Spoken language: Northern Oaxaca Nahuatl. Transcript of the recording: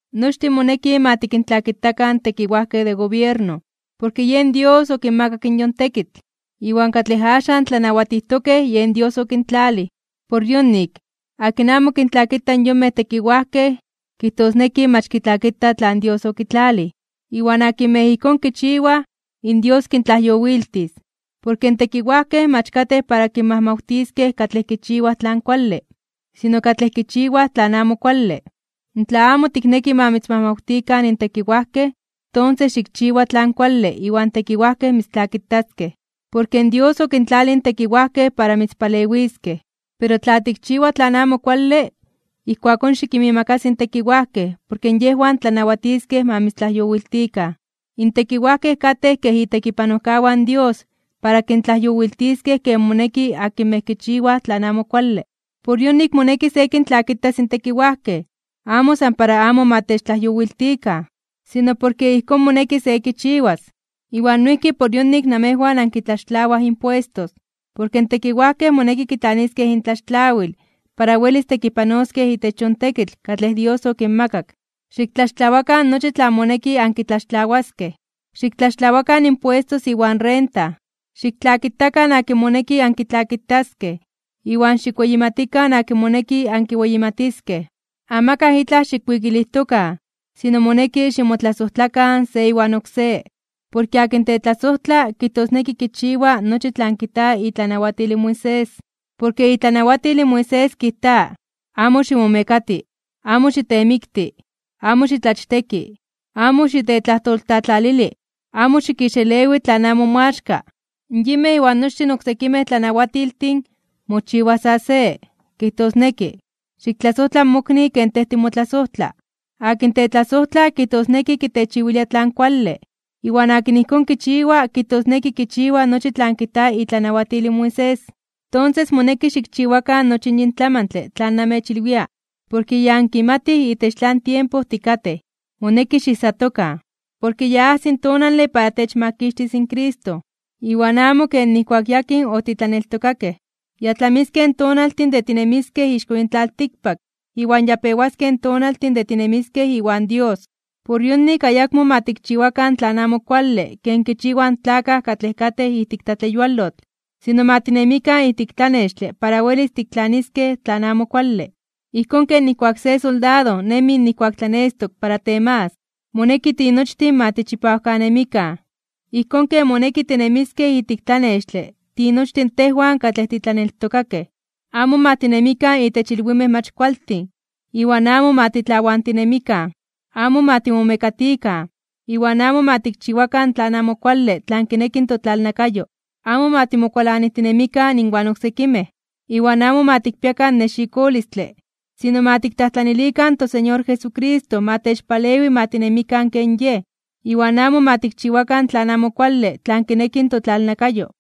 Nochtin moneki ma kintlakitakan in tekiwajkej de gobierno. Porke yen Dios okinmakak in yon tekitl, iwan katlej axan tlanawatijtokej, yen Dios okintlalij. Por yonik, akin amo kintlakita in yonmej tekiwajkej, kijtosneki mach kitlakita tlan Dios okitlalij. Iwan akinmej ijkón kichiwaj in Dios kintlajyowiltis. Porke in tekiwajkej mach katej para kinmajmawtiskej katlej kichiwaj tlan kuale, sino katlej kichiwaj tlan amo kuale. Tla amo tikneki ma mitzmajmawtikan in tekiwajkej, tonses xikchiwa tlan kuale iwan in tekiwajkej mitztlakitaskej. Porke Dios okintlalij in tekiwajkej para mitzpalewiskej. Pero tla tikchiwa tlan amo kuale, ijkuakón xikinmiimakasi in tekiwajkej porke yejwan tlanawatiskej ma mitztlajyowiltikan. In tekiwajkej katej kej itekipanojkawan in Dios para kintlajyowiltiskej ken moneki akinmej kichiwaj tlan amo kuale. Por yonik moneki se kintlakitas in tekiwajkej, amo san para amo ma techtlajyowiltikan, sino porke ijkón moneki se kichiwas. Iwan noijki por yonik namejwan ankitlaxtlawaj impuestos. Porke in tekiwajkej moneki kitlaniskej intlaxtlawil para welis tekipanoskej itech yon tekitl katlej Dios okinmakak. Xiktlaxtlawakan nochi tlan moneki ankitlaxtlawaskej. Xiktlaxtlawakan impuestos iwan renta. Xiktlakitakan akin moneki ankitlakitaskej, iwan xikweyimatikan akin moneki ankiweyimatiskej. Amakaj itlaj xikwikilijtokan, sino moneki ximotlasojtlakan se iwan oksé. Porke akin tetlasojtla kijtosneki kichiwa nochi tlan kijta itlanawatil in Moisés. Porke itlanawatil in Moisés kijta: “Amo ximomekati, amo xitemikti, amo xitlachteki, amo xitetlajtoltlatlalili, amo xikixelewi tlan amo moaxka”. Yinmej iwan nochtin oksekimej tlanawatiltin mochiwa sa se, kijtosneki: “Xiktlasojtla in mokni ken tej timotlasojtla.” Akin tetlasojtla kijtosneki kitechiwilia tlan kuale. Iwan akin ijkón kichiwa kijtosneki kichiwa nochi tlan kijta itlanawatil in Moisés. Tonses, moneki xikchiwakan nochi yin tlamantle tlan namechilwia, porke ya ankimatij itech tlan tiempo tikatej. Moneki xiijsatokan, porke ya ajsi tonale para techmakixtis in Cristo, iwan amo ken nijkuak yakin otitlaneltokakej. Ya tlamiskej in tonaltin de tinemiskej ixko yin tlaltikpak, iwan ya pewaskej in tonaltin de tinemiskej iwan Dios. Por yonik ayakmo ma tikchiwakan tlan amo kuale ken kichiwaj in tlakaj katlej katej ijtik tlatleyualotl, sino ma tinemikan ijtik tlanextle para welis tiktlaniskej tlan amo kuale, ijkón ken nijkuak se soldado nemi nijkuak tlanestok para temagas. Moneki tinochtin ma tichipawkanemikan, ijkón ken moneki tinemiskej ijtik tlanextle tinochtin tejwan katlej titlaneltokakej. Amo ma tinemikan itech ilwimej mach kualtin, iwan amo ma titlawantinemikan. Amo ma timomekatikan, iwan amo ma tikchiwakan tlan amo kuale tlan kineki totlalnakayo. Amo ma timokualanijtinemikan inwan oksekimej. Iwan amo ma tikpiakan nexikolistle. Sino ma tiktlajtlanilikan toSeñor Jesucristo ma techpalewi ma tinemikan ken Yej, iwan amo ma tikchiwakan tlan amo kuale tlan kineki totlalnakayo.